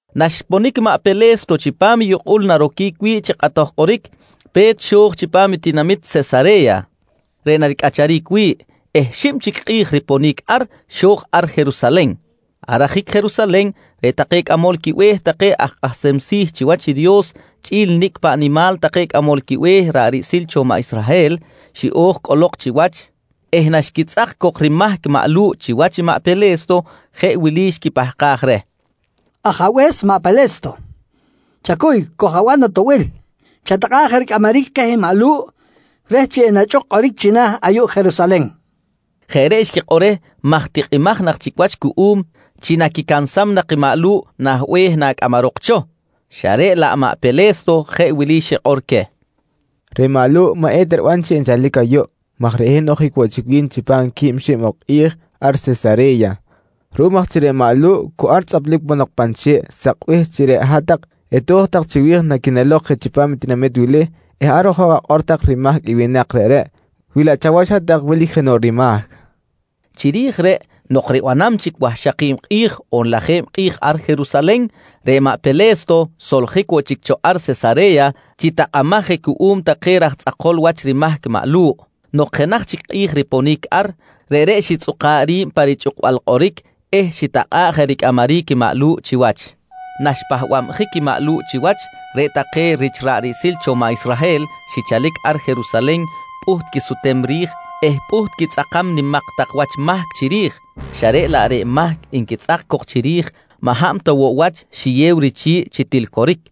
Naxponic maꞌ Pele̱sto chipam i yukꞌul naroquic wi̱ꞌ chi kꞌatoj kꞌoric, pe̱t xo̱j chipam i tinamit Sesare̱ya reꞌ naricꞌacharic wi̱ꞌ eh xib chic kꞌi̱j riponic ar, xo̱j ar Jerusalen. Ar ajic Jerusalen reꞌ take cꞌamol quibe̱h take aj kꞌahsem si̱ chiwach i Dios chꞌi̱l nicꞌ paꞌ nimal take cꞌamol quibe̱h ra̱ꞌ riꞌsil cho maꞌ Israhel xiꞌo̱j cꞌolok chiwach eh naxquitzꞌak cok rimahc maꞌ Lu̱ꞌ chiwach i maꞌ Pele̱sto, jeꞌ wili xquipahkaj reh: «Ajabe̱s maꞌ Pele̱sto, chacuy, koj-aban atoꞌbil. Chatakꞌa̱ꞌ je ricꞌamaric keh maꞌ Lu̱ꞌ reh chi enachꞌuk kꞌoric china̱ ayuꞌ Jerusalen, nqui take reh. Jeꞌ reꞌ xquikꞌor reh maj tikꞌimaj nak chic wach cuꞌum chi naquicansam nak i maꞌ Lu̱ꞌ nah be̱h nacꞌamarok cho, xa reꞌ laꞌ maꞌ Pele̱sto jeꞌ wili xikꞌor queh: «Reꞌ maꞌ Lu̱ꞌ maꞌ eta riban chi enchalic ayuꞌ maj reꞌ hin ojic woꞌ chic wi̱n chipam quib xib ok kꞌi̱j ar Sesare̱ya. Ruꞌum aj chi reꞌ maꞌ Lu̱ꞌ cu ar tzꞌaplic ponok pan che̱ꞌ sakbih chi reꞌ hat-tak eto̱j tak chiwi̱j naquinelok je chipam i tinamit wili eh ar ojok akꞌor tak rimahc i winak reꞌreꞌ wilaꞌ chawach hat-tak wilic jenoꞌ rimahc, nqui queh. Chiri̱j reꞌ nok ribanam chic wahxaki̱b kꞌi̱j on lajeb kꞌi̱j ar Jerusalen, reꞌ maꞌ Pele̱sto soljic woꞌ chic cho ar Sesare̱ya chi tahkamaj je cuꞌum take raj tzꞌakol wach rimahc maꞌ Lu̱ꞌ. Nok jenaj chic kꞌi̱j riponic ar, reꞌreꞌ xitzꞌuka̱ꞌ ri̱b pa richꞌukbal kꞌoric eh xitakꞌa̱ꞌ je ricꞌamaric i maꞌ Lu̱ꞌ chiwach. Naxpahbabjic i maꞌ Lu̱ꞌ chiwach, reꞌ take rich ra̱ꞌ riꞌsil cho maꞌ Israhel xichalic ar Jerusalen pꞌuht quisutem ri̱j eh pꞌuht quitzꞌakam nimak tak wach mahc chiri̱j, xa reꞌ laꞌ reꞌ mahc nquitzꞌak cok chiri̱j, maꞌ hab ta woꞌ wach xiyew richi̱ꞌ chi til coric.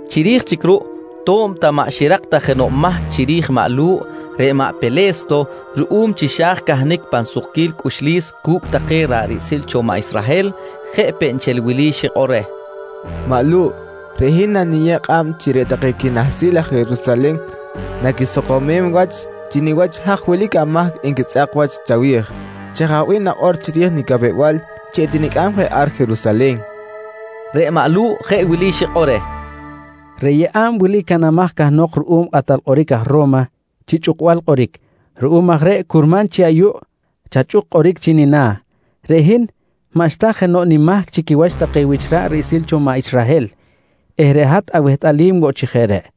Chiri̱j chic ruꞌ to̱b ta maꞌ xirak ta jenoꞌ mahc chiri̱j maꞌ Lu̱ꞌ, reꞌ maꞌ Pele̱sto ruꞌum chi xa̱j cahnic pan sukquil cꞌuxlis cu̱cꞌ take ra̱ꞌ riꞌsil cho maꞌ Israhel, jeꞌ peꞌ nchel wili xikꞌor reh: «Maꞌ Lu̱ꞌ, reꞌ hin naniyeb kꞌab chi reꞌ take quinahsil aj Jerusalen naquisakomem wach chi niwach haj wilic amahc nquitzꞌak wach chawi̱j. Chaj aj bih nakꞌor chiri̱j nicapew-bal chi etinicꞌam je ar Jerusalen? nqui reh. Reꞌ maꞌ Lu̱ꞌ jeꞌ wili xikꞌor reh: «Reꞌ yeꞌa̱b wili canamaj cahnok ruꞌum kꞌatal kꞌoric aj Ro̱ma chi chꞌukbal kꞌoric. Ruꞌum aj reꞌ curman chi ayuꞌ chachꞌuk kꞌoric chi nina̱. Reꞌ hin maꞌxta jenoꞌ nimahc chi quiwach take wich ra̱ꞌ riꞌsil cho maꞌ Israhel eh reꞌ hat awehtꞌalim woꞌ chi jeꞌ reꞌ.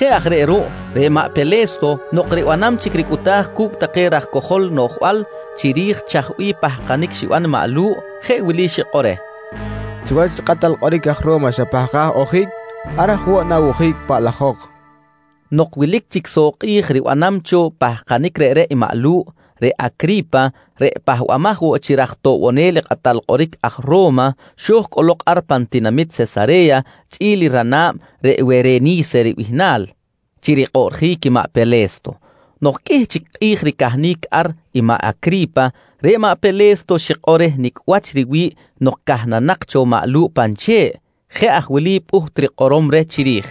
Jeꞌ aj reꞌ ruꞌ, reꞌ maꞌ Pele̱sto nok ribanam chic ricꞌuta̱j cu̱cꞌ take raj cojol noꞌjbal chiri̱j chaj bih pahkanic xiban maꞌ Lu̱ꞌ, jeꞌ wili xikꞌor reh: «Chiwach kꞌatal kꞌoric aj Ro̱ma xapahkaj ojic, ar aj woꞌ na̱wojic paꞌlajok, nqui reh. Nok wilic chic soꞌ kꞌi̱j ribanam cho pahkanic reꞌreꞌ i maꞌ Lu̱ꞌ, reꞌ Acri̱pa, reꞌ pahbamaj woꞌ chi raj toꞌbonel i kꞌatal kꞌoric aj Ro̱ma, xo̱j cꞌolok ar pan tinamit Sesare̱ya chꞌi̱l i rana̱b reꞌ Wereni̱se ribihnal chi rikꞌoꞌrjic i maꞌ Pele̱sto. Nok qꞌuih chic kꞌi̱j ricahnic ar i maꞌ Acri̱pa, reꞌ maꞌ Pele̱sto xikꞌor reh nicꞌ wach riwi̱ꞌ nok cahnanak cho maꞌ Lu̱ꞌ pan che̱ꞌ. Jeꞌ aj wili pꞌuht rikꞌorom reh chiri̱j: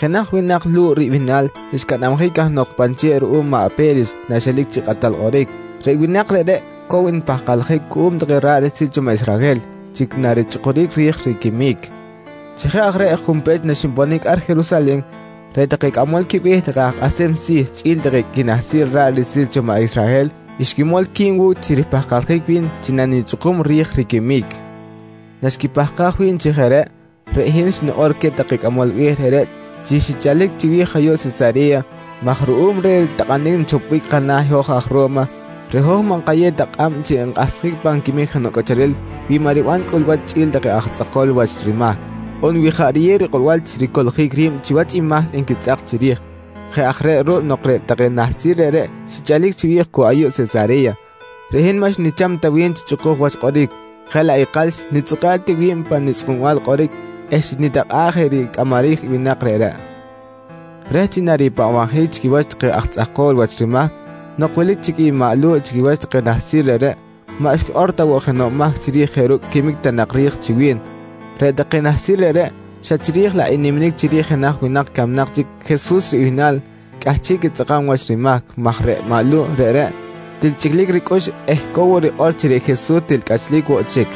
«Jenaj winak Lu̱ꞌ ribihnal xcanabjic cahnok pan che̱ꞌ ruꞌum maꞌ Pe̱lix naxelic chi kꞌatal kꞌoric. Reꞌ winak reꞌreꞌ cow npahkaljic cuꞌum take ra̱ꞌ riꞌsil cho maꞌ Israhel chi narichꞌukuric ri̱j riquimic. Chi jeꞌ aj reꞌ junpech naxinponic ar Jerusalen, reꞌ take cꞌamol quibe̱h take aj kꞌahsem si̱ chꞌi̱l take quinahsil ra̱ꞌ riꞌsil cho maꞌ Israhel xquimol qui̱b wu̱cꞌ chi ripahkaljic wi̱n chi nanichꞌukum ri̱j riquimic. Naxquipahkaj wi̱n chi jeꞌ reꞌ, reꞌ hin xnikꞌor queh take cꞌamol be̱h reꞌreꞌ chi xichalic chiwi̱j ayuꞌ Sesare̱ya maj ruꞌum reh takꞌanic nchopbic kana̱ i hoj aj Ro̱ma, reꞌ hoj maꞌ nkayew ta kꞌab chi enkꞌahsjic pan quimic jenoꞌ cꞌacharel wi maꞌ ribanam cꞌulwa̱ch chꞌi̱l take aj tzꞌakol wach rimahc, on wi jaꞌ riyew rikꞌorbal chi ricoꞌljic ri̱b chiwach i mahc nquitzꞌak chiri̱j. «Jeꞌ aj reꞌ ruꞌ nok reꞌ take nahsil reꞌreꞌ xichalic chiwi̱j cu ayuꞌ Sesare̱ya, reꞌ hin maꞌ xnicham ta wi̱b chi chꞌukuj wach kꞌoric jeꞌ laꞌ ikal xnitzꞌuka̱ꞌ ti wi̱b pa nichꞌukbal kꞌoric eh xnitakꞌa̱ꞌ je ricꞌamaric i winak reꞌreꞌ reh chi naripahbabjic chi quiwach take aj tzꞌakol wach rimahc. Nok wilic chic i maꞌ Lu̱ꞌ chi quiwach take nahsil reꞌreꞌ, maꞌ xquikꞌor ta woꞌ jenoꞌ mahc chiri̱j jeꞌ ru̱cꞌ quimic ta nak ri̱j chi wi̱n. Reꞌ take nahsil reꞌreꞌ, xa chiri̱j laꞌ i niminic chiri̱j jenaj winak camnak chic Jesus ribihnal cꞌahchiꞌ quitzꞌakam wach rimahc maj reꞌ maꞌ Lu̱ꞌ reꞌreꞌ til chꞌiclic ricꞌux eh cow rikꞌor chi reꞌ Jesus til cꞌachlic woꞌ chic.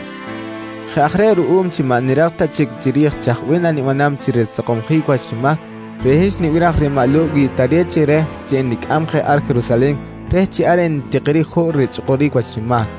Jeꞌ aj reꞌ ruꞌum chi maꞌ nirak ta chic chiri̱j chaj bih nanibanam chi risakomsjic wach rimahc, reꞌ hin xnibiraj reh maꞌ Lu̱ꞌ wi tare̱t chi reh chi enicꞌam je ar Jerusalen reh chi ar entikiric juꞌ richꞌukuric wach rimahc.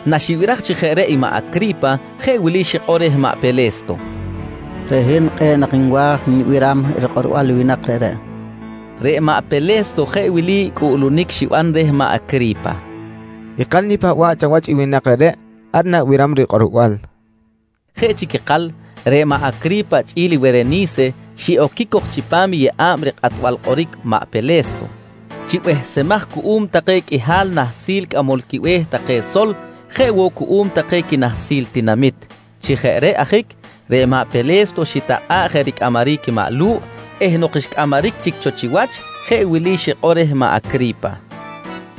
Naxibiraj chi jeꞌ reꞌ i maꞌ Acri̱pa jeꞌ wili xikꞌor reh maꞌ Pele̱sto: «Reꞌ hin kꞌe̱ꞌ nak nwa̱j nibiram rikꞌorbal i winak reꞌreꞌ, nqui reh. Reꞌ maꞌ Pele̱sto jeꞌ wili cꞌuꞌlunic xiban reh maꞌ Acri̱pa: «Ikal nipahba̱ꞌ chawach i winak reꞌreꞌ. Ar na̱biram rikꞌorbal, nqui reh. Jeꞌ chic ikal, reꞌ maꞌ Acri̱pa chꞌi̱l Wereni̱se xiꞌoquic cok chipam yeꞌa̱b rikꞌatbal kꞌoric maꞌ Pele̱sto chi behsemaj cuꞌum take qꞌuihal nahsil cꞌamol quibe̱h take sol jeꞌ woꞌ cuꞌum take quinahsil i tinamit. Chi jeꞌ reꞌ ajic reꞌ maꞌ Pele̱sto xitakꞌa̱ꞌ je ricꞌamaric i maꞌ Lu̱ꞌ eh nok xcꞌamaric chic cho chiwach, jeꞌ wili xikꞌor reh maꞌ Acri̱pa: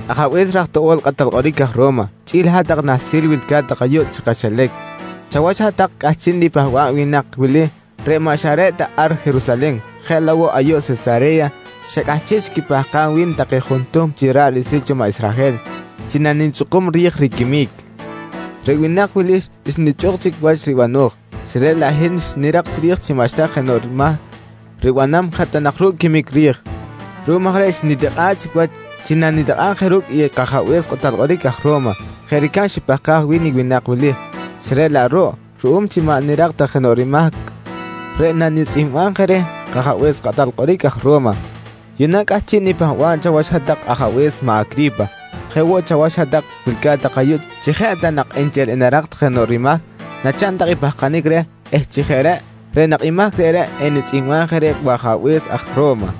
«Ajabe̱s raj toꞌo̱l kꞌatal kꞌoric aj Ro̱ma chꞌi̱l hat-tak nahsil wilca̱t tak ayuꞌ chi kaxilac, chawach hat-tak cꞌahchiꞌ nipahba̱b i winak wili reꞌ maꞌ xa reꞌ ta ar Jerusalen jeꞌ laꞌ woꞌ ayuꞌ Sesare̱ya xa cꞌahchiꞌ chic quipahkam wi̱n take juntuhm chi ra̱ꞌ riꞌsil cho maꞌ Israhel chi nanichꞌukum ri̱j riquimic. Reꞌ winak wili xnichꞌuk chic wach ribano̱j xa reꞌ laꞌ hin xnirak chiri̱j chi maꞌxta jenoꞌ mahc ribanam jeꞌ ta nak ru̱cꞌ quimic ri̱j. Ruꞌum aj reꞌ xnitikꞌa̱ꞌ chic wach chi nanitakꞌa̱b je ru̱cꞌ i kajabe̱s kꞌatal kꞌoric aj Ro̱ma, jeꞌ ricab xipahkaj wi̱n i winak wili, xa reꞌ laꞌ ruꞌ ruꞌum chi maꞌ nirak ta jenoꞌ rimahc reꞌ nanitzꞌihmbam je reh kajabe̱s kꞌatal kꞌoric aj Ro̱ma, yuꞌna cꞌahchiꞌ nipahba̱b chawach hat ajabe̱s maꞌ Acri̱pa, jeꞌ woꞌ chawach hat-tak wilca̱t tak ayuꞌ chi jeꞌ ta nak nchel enarak tak jenoꞌ rimahc nachaꞌn tak i pahkanic reh eh chi jeꞌ reꞌ, reꞌ nak i mahc reꞌreꞌ enitzꞌihmbaj je reh wajabe̱s aj Ro̱ma.